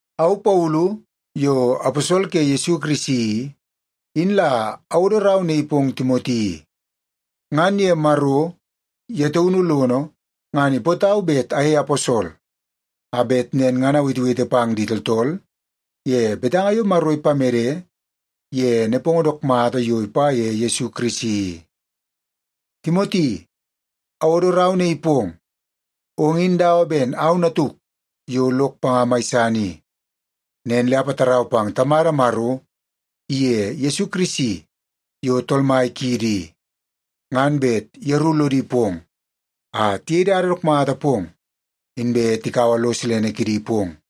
Au Paulu yo aposol ke Yesu Kirisi i, in la awodo rau naii pong Timoti i. Ngan ye Maro ye taunu lono, ngan ipootau bet ayei aposol a bet nen ngan awetewete pang di tooltool ye betanga yo Maro ipamede ye nepongo dook mata yo ipa ye Yesu Kirisi i. Timoti, awodo rau naii pong. Ong in dawa ben au natuk yo lok panga mai san i. Nen le apatarau pang Tamada Maro iye Yesu Kirisi yo Tool Mai kiidi i, ngan bet yeru lodi pong a tiyei dada dook mata pong inbe tikaua lo silene kidi pong.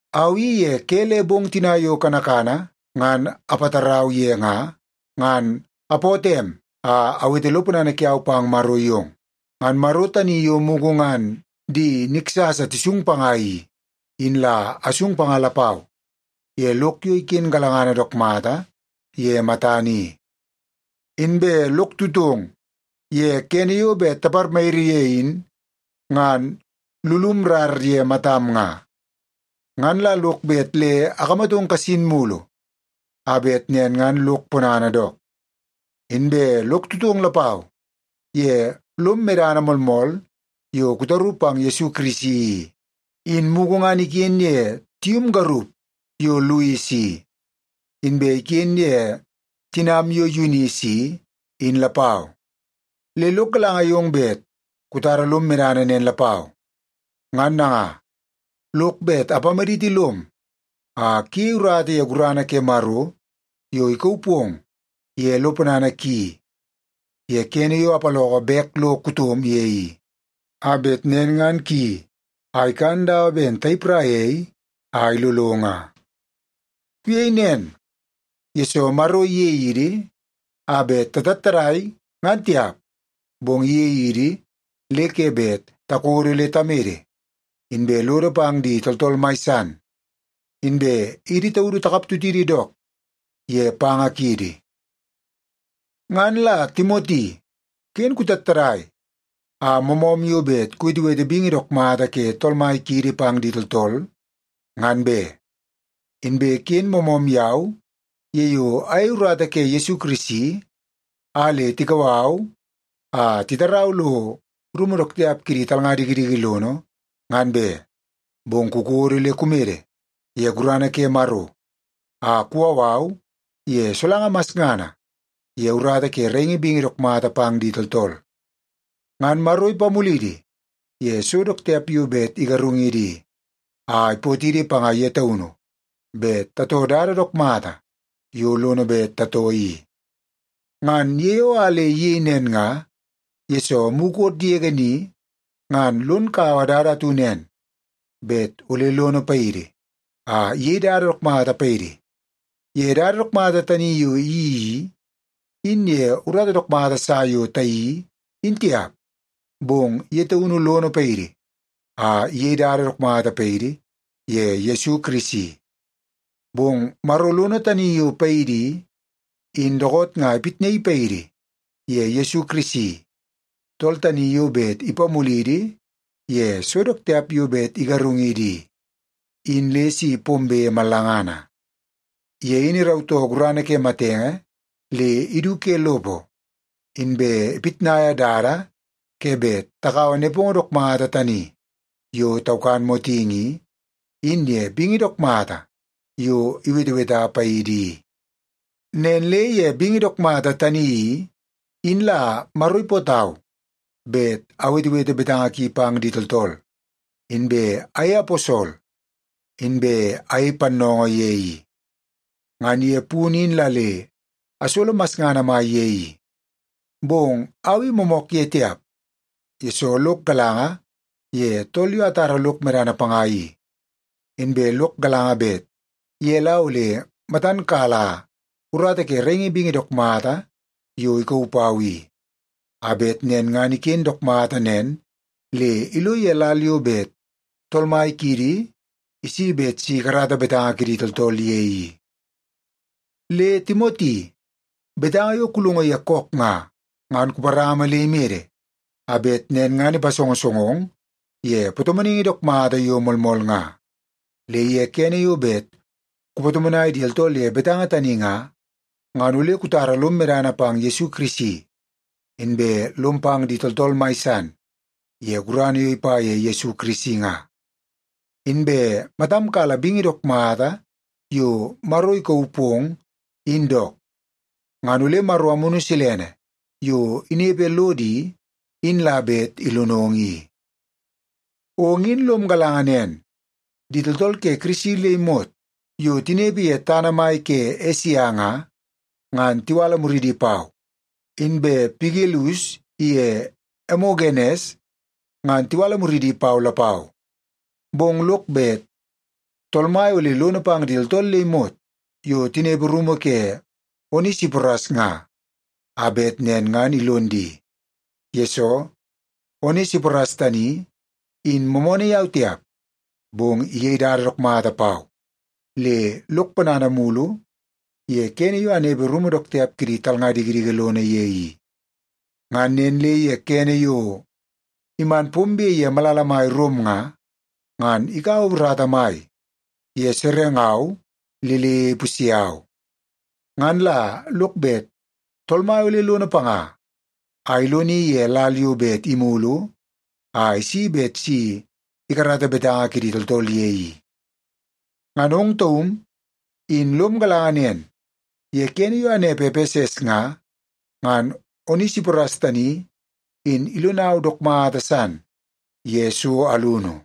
Au i ye ke le bong tina yo kanakana ngan apatarau ye nga, ngan apootoo em a awete lo ponana kiau pang Maro yong. Ngan Maro tani yo mugu ngan di niksasa tisung panga i, in la asung panga lapau ye lok yo iken galangana dook mata ye matana i. Inbe lok tutong ye kene yo bet taparmayiri ye in ngan lulum rar ye matam nga. Ngan la lok bet le akamatong kasin mulu a bet nen ngan lok ponana dook. Inbe lok tutong lapau ye lom medana moolmool yo kutaru pang Yesu Kirisi i, in mugu ngan iken ye tium garup yo Lois i, inbe iken ye tinam yo Yunis i, in lapau. Le lok galanga yong bet kutara lom medana nen lapau. Ngan nanga, lok bet apamaditi lom a kuyei urata ye gurana ke Maro yo ikauu pong ye lo ponana ki ye kene yo apaloko bek lo kutom ye i, a bet nen ngan kuyeii a ikan dawa ben tayipraia ei a ilolo nga. Kuyei nen, yesoo Maro iyei idi a bet tatattadai, ngan tiap. Bong iyei idi le ke bet takodo le tamede, inbe lodo pang di tooltool mai san, inbe idi taudu takaptutidi dook ye panga kiidi. Ngan la Timoti, ken kutattadai a moomoom yo bet kuwetewete bingi dook mata ke Tool Mai kiidi pang di tooltool, ngan be. Inbe ken moomoom yau ye yo ayei urata ke Yesu Kirisi a le tikau au a titarau lo rumu dook tiap kidi talnga dikidiki lono, ngan be. Bong kukodo le kumede ye gurana ke Maro a kuwau au ye solanga masngana ye urata ke raingi bingi dook mata pang di tooltool. Ngan Maro ipamulidi ye so dook tiap yo bet igarungidi i, a ipootidi panga ye taunu bet tatoo dada dook mata yo lono bet tatoo i. Ngan ye yo a le iyei nen nga, yesoo mukot yege ni ngan lon kaua dada atu nen bet ole lono paidi a iyei dada dook mata paidi. Ye dada dook mata tani yo iyeii i, in ye urata dook mata sa yo tayeii, in tiap. Bong ye taunu lono paidi a iyei dada dook mata paidi ye Yesu Kirisi. Bong Maro lono tani yo paidi i, in dookoot nga ipitnaii paidi ye Yesu Kirisi, tool tani yo bet ipamulidi ye so dook tiap yo bet igarungidi i, in le si pombe mallangana. Ye in irautoo gurana ke matenge le idu ke lopo, inbe ipitnaia dada ke bet takaua nepongo dook mata tani yo taukan motingi i, in ye bingi dook mata yo iweteweta paidi i. Nen le ye bingi dook mata tani i, in la Maro ipootau bet awetewete betanga ki pang di tooltool, inbe ayei aposol, inbe ayei pannoongoo ye i. Ngan ye punu in la le asolo masngana mai ye i. Bong au i moomook ye tiap, yesoo lok galanga ye tool yo atara lok medana panga i. Inbe lok galanga bet ye la ole matan kala urata ke raingi bingi dook mata yo ikauu pau i, a bet nen ngan iken dook mata nen le ilo ye lal yo bet Tool Mai kiidi isi bet si ikarata betanga kidi tooltool ye i. Le Timoti, betanga yo kulongo ye kook nga, ngan kuparama le imede a bet nen ngan ipasongosongong ye patomonaingi dook mata yo moolmool nga. Le ye kene yo bet kupatomonai di tooltool ye betanga tani nga, ngan ole kutara lom medana pang Yesu Kirisi, inbe lom pang di tooltool mai san ye gurana yo ipa ye Yesu Kirisi nga. Inbe matam kala bingi dook mata yo Maro ikauu pong, in dook. Ngan ole Maro Amunu Silene yo inepe lodo i, in la bet ilonong i. Ong in lom galanga nen, di tooltool ke Kirisi le imot yo tinepe ye tana mai ke Esia nga, ngan tiwala muridi pau. Inbe Pigelus iye Emogenes ngan tiwala muridi pau lapau. Bong lok bet Tool Mai ole lono pang di tooltool le imot yo tinepe rumu ke Onesiporas nga, a bet nen ngan ilon di. Yesoo, Onesiporas tani in moomoonoo yau tiap, bong iyei dada dook mata pau le lok ponana mulu ye kene yo anepe ye rumu dook tiap kidi talnga dikidiki lono ye i. Ngan nen le ye kene yo iman pombe ye malala mai Rom nga, ngan ikaua urata mai ye serengau le le ipusye au. Ngan la lok bet Tool Mai ole lono panga a iloni ye lal yo bet imulu a isi bet si ikarata betanga kidi tooltool ye i. Ngan ong taum in lom galanga nen ye kene yo anepe Epeses nga, ngan Onesiporas tani in ilonau dook mata san ye so alunu.